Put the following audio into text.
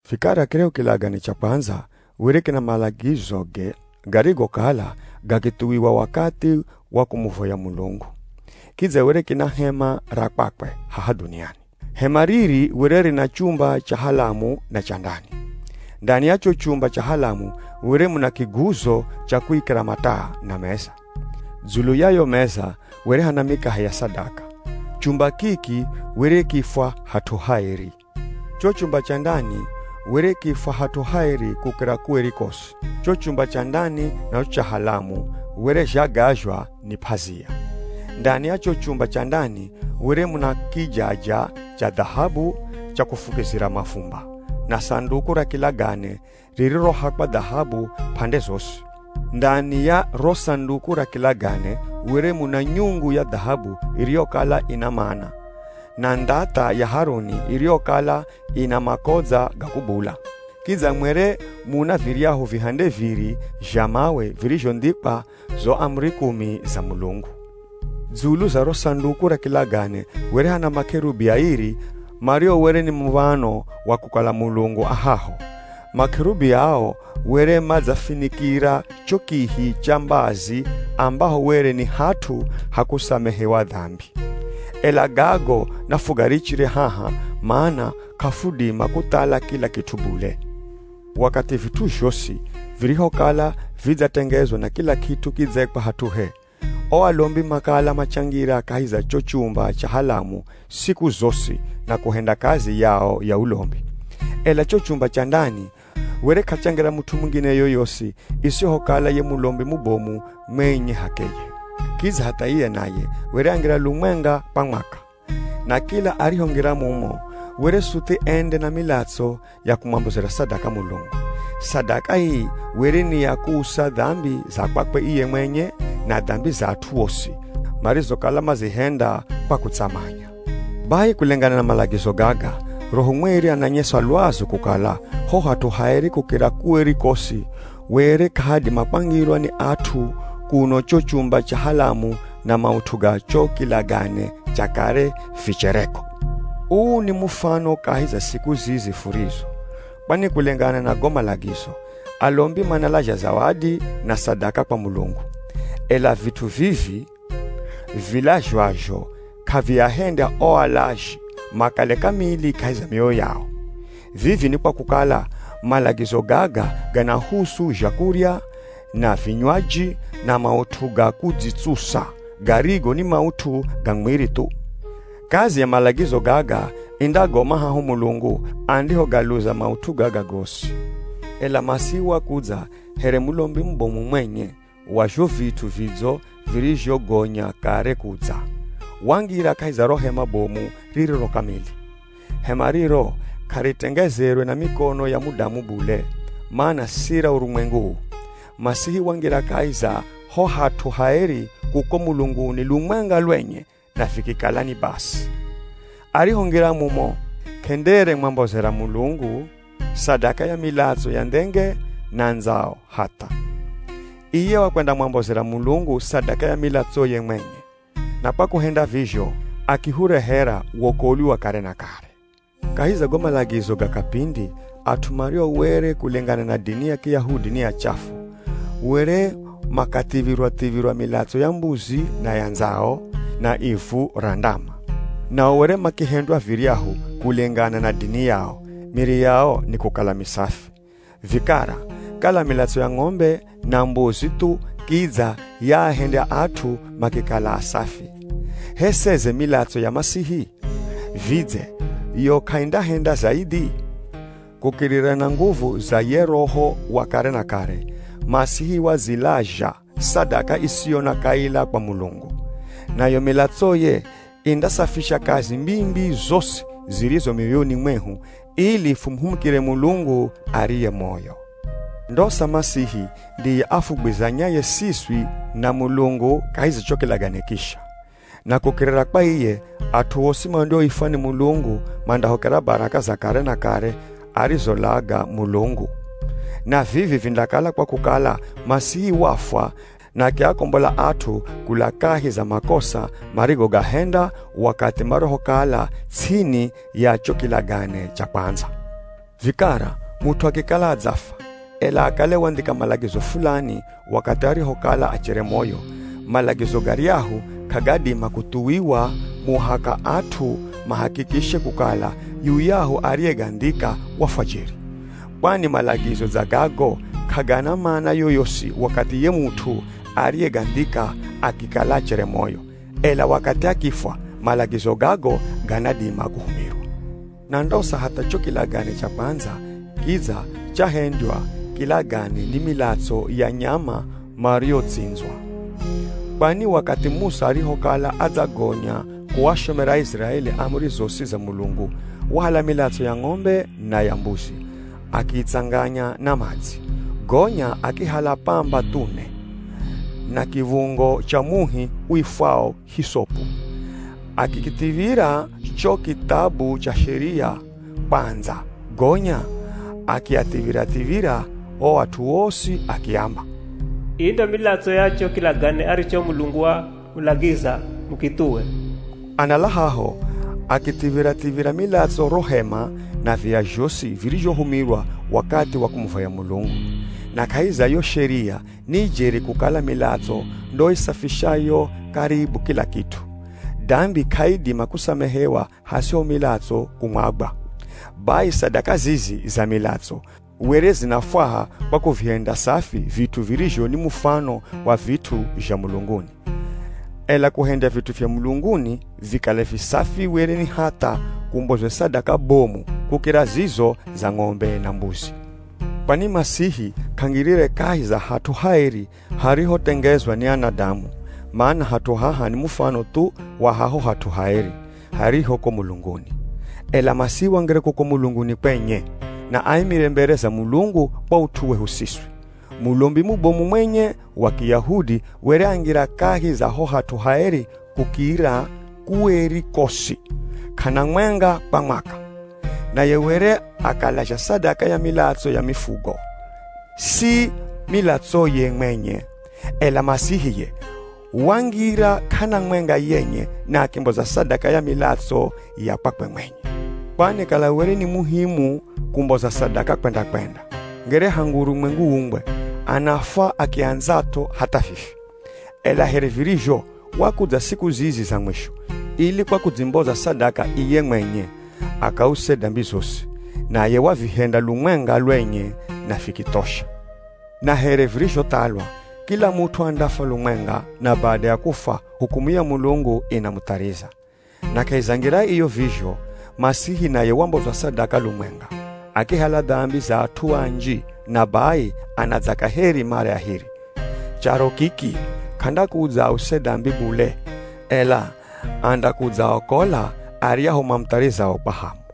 Vikara kiryahu kilagane cha kwandza, were kina malagizoge garigokala gakithuwiwa wakathi wa kumuvoya Mulungu. Kidza were kina hema ra kwakwe haha dhuniani. Hema riri were rina chumba cha halamu na cha ndani. Ndani ya cho chumba cha halamu were muna kiguzo cha kuikira mataa, na meza. Dzulu ya yo meza were hana mikahe ya sadaka. Chumba kiki were kiifwa Hat'u Haeri. Cho chumba cha ndani were kiifwa Hat'u Haeri Kukira Kueri Kosi. Cho chumba cha ndani na cho cha halamu were zhagazhwa ni p'azia. Ndani ya cho chumba cha ndani were muna kijaja cha dhahabu cha kufukizira mavumba, na Sanduku ra Kilagane ririrohakwa dhahabu p'ande zosi. Ndani ya ro Sanduku ra Kilagane were muna nyungu ya dhahabu iriyokala ina Mana, na ndhath'a ya Haruni iriyokala ina makodza ga kubula. Kidza mwere muna viryahu vihande viri zha mawe virizhondhikwa zo amuri kumi za Mulungu. Dzulu za ro Sanduku ra Kilagane were hana makerubi airi mario were ni muv̱ano wa kukala Mulungu a haho. Makerubi ao were madzafinikira cho kihi cha mbazi ambaho were ni hat'u ha kusamehewa dambi. Ela gago nafugarichire haha mana k'afudima kuthala kila kit'u bule. Wakathi vit'u zhosi virihokala vidzatengezwa na kila kit'u kidzaikwa hat'uhe, o alombi makala machangira kahi za cho chumba cha halamu siku zosi na kuhenda kazi yao ya ulombi. Ela cho chumba cha ndani were k'achangira mut'u mungine yoyosi isihokala ye mulombi mubomu mwenye h'akeye. Kidza hatha iye naye were angira lumwenga kwa mwaka. Na kila arihongira mumo, were suthi ende na milatso ya kumwambozera sadaka Mulungu. Sadaka ii were ni ya kuusa dambi za kwakwe iye mwenye, na dambi za at'u osi, marizokala mazihenda kwa kutsamanya. Bai kulengana na malagizo gaga, Roho Mweri ananyesa lwazu kukala ho Hat'u Haeri Kukira Kueri Kosi were k'ahadima kwangirwa ni at'u kuno cho chumba cha halamu na maut'u ga cho kilagane cha kare vichereko. Uu ni mufano kahi za siku zizi furizo. Kwani kulengana na go malagizo, alombi manalazha zawadi na sadaka kwa Mulungu. Ela vit'u vivi vilazhwazho k'aviahendya o alazhi makale kamili kahi za mioyo yao. Vivi ni kwa kukala, malagizo gaga ganahusu zhakurya, na vinywaji, na maut'u ga kudzitsusa, garigo ni maut'u ga mwiri thu. Kazi ya malagizo gaga indagoma haho Mulungu andihogaluza maut'u gaga gosi. Ela Masihi wakudza here mulombi mubomu mwenye wa zho vit'u vidzo virizhogonya kare kudza. Wangira kahi za ro hema bomu ririro kamili. Hema riro k'aritengezerwe na mikono ya mudamu bule, mana si ra urumwengu uu. Masihi wangira kahi za ho Hat'u Haeri kuko mulunguni lumwenga lwenye na vikikala ni basi. Arihongira mumo k'enderemwambozera Mulungu sadaka ya milatso ya ndhenge, na ndzao, hatha. Iye wakwendamwambozera Mulungu sadaka ya milatsoye mwenye. Na kwa kuhenda vizho akihurehera wokolwi wa kare na kare. Kahi za go malagizo ga kapindi, at'u mario were kulengana na dini ya Kiyahudi ni achafu, were makathiv̱irwa-thiv̱irwa milatso ya mbuzi na ya ndzao, na ivu ra ndama. Nao were makihendwa viryahu, kulengana na dini yao, miri yao nikukala misafi. Vikara, kala milatso ya ng'ombe na mbuzi thu kidza yaahendya at'u makikala asafi, h'e seze milatso ya Masihi? Vidze yo k'aindahenda zaidhi? Kukirira na nguvu za ye Roho wa kare na kare, Masihi wadzilazha sadaka isiyo na kaila kwa Mulungu. Nayo milatsoye indasafisha kazi mbii-mbii zosi zirizo mioyoni mwehu, ili fumuhumikire Mulungu ariye moyo. Ndosa Masihi ndiye afugwizanyaye siswi na Mulungu kahi za cho kilagane kisha. Na kukirira kwa iye, at'u osi mandioifwa ni Mulungu mandahokera baraka za kare na kare arizolaga Mulungu. Na vivi vindakala kwa kukala Masihi wafwa na akiakombola at'u kula kahi za makosa marigogahenda wakathi marihokala ts'ini ya cho kilagane cha kwandza. Vikara, mut'u akikala adzafwa, ela akale wandhika malagizo fulani wakathi arihokala achere moyo, malagizo garyahu k'agadima kuthuwiwa muhaka at'u mahakikishe kukala yuyahu ariyegandhika wafwa jeri. Kwani malagizo dza gago k'agana mana yoyosi wakathi ye mut'u ariyegandhika akikala achere moyo. Ela wakathi akifwa malagizo gago ganadima kuhumirwa. Na ndosa hatha cho kilagane cha kwandza kidza chahendywa kilagane ni milatso ya nyama mariotsindzwa. Kwani wakathi Musa arihokala adzagonya kuashomera Aiziraeli amuri zosi za Mulungu, wahala milatso ya ng'ombe na ya mbuzi, akiitsanganya na madzi. Gonya akihala pamba thune, na kiv̱ungo cha muhi uifwao hisopu, akikithiv̱ira cho kithabu cha Sheria kwandza gonya akiathiv̱ira-thiv̱ira o at'u osi akiamba, “ii ndo milatso ya cho kilagane aricho Mulungu wamulagiza mukithuwe.” Anala haho, akithiv̱ira-thiv̱ira milatso ro hema na viya zhosi virizhohumirwa wakathi wa kumuvoya Mulungu. Na kahi za yo sheria ni jeri kukala milatso ndo isafishayo karibu kila kit'u. Dambi k'aidima kusamehewa hasiho milatso kumwagwa. Bai sadaka zizi za milatso were zinafwaha kwa kuvihendya safi vit'u virizho ni mufano wa vit'u zha mulunguni. Ela kuhendya vit'u zha mulunguni vikale visafi were ni hatha kumbozwe sadaka bomu kukira zizo za ng'ombe na mbuzi. Kwani Masihi k'angirire kahi za hat'u haeri harihotengezwa ni anadamu, mana hat'u haha ni mufano thu wa haho hat'u haeri, hariho ko mulunguni. Ela Masihi wangira kuko mulunguni kwenye, na aimire mbere za Mulungu kwa ut'u wehu siswi. Mulombi mubomu mwenye wa Kiyahudi were angira kahi za ho Hat'u Haeri Kukira Kueri Kosi, k'ana mwenga kwa mwaka. Naye were akalazha sadaka ya milatso ya mifugo, si milatsoye mwenye. Ela Masihi ye, wangira k'ana mwenga yenye na akimboza sadaka ya milatso ya kwakwe mwenye. Kwani kala were ni muhimu kumboza sadaka kwenda-kwenda, ngere hangu urumwengu uumbwe, anafwa akiandzat'o hatha vivi. Ela here virizho, wakudza siku zizi za mwisho, ili kwa kudzimboza sadaka iye mwenye, akause dambi zosi. Naye wavihenda lumwenga lwenye na vikithosha. Na here virizhothalwa, kila mut'u andafwa lumwenga, na bada ya kufwa, hukumu ya Mulungu inamuthariza. Na kahi za ngira iyo vizho, Masihi naye wambozwa sadaka lumwenga, akihala dambi za at'u anji, na bai anadza kaheri mara ya hiri. Charo kiki, k'andakudza ause dambi bule, ela andakudzaaokola aryahu mamutharizao kwa hamu.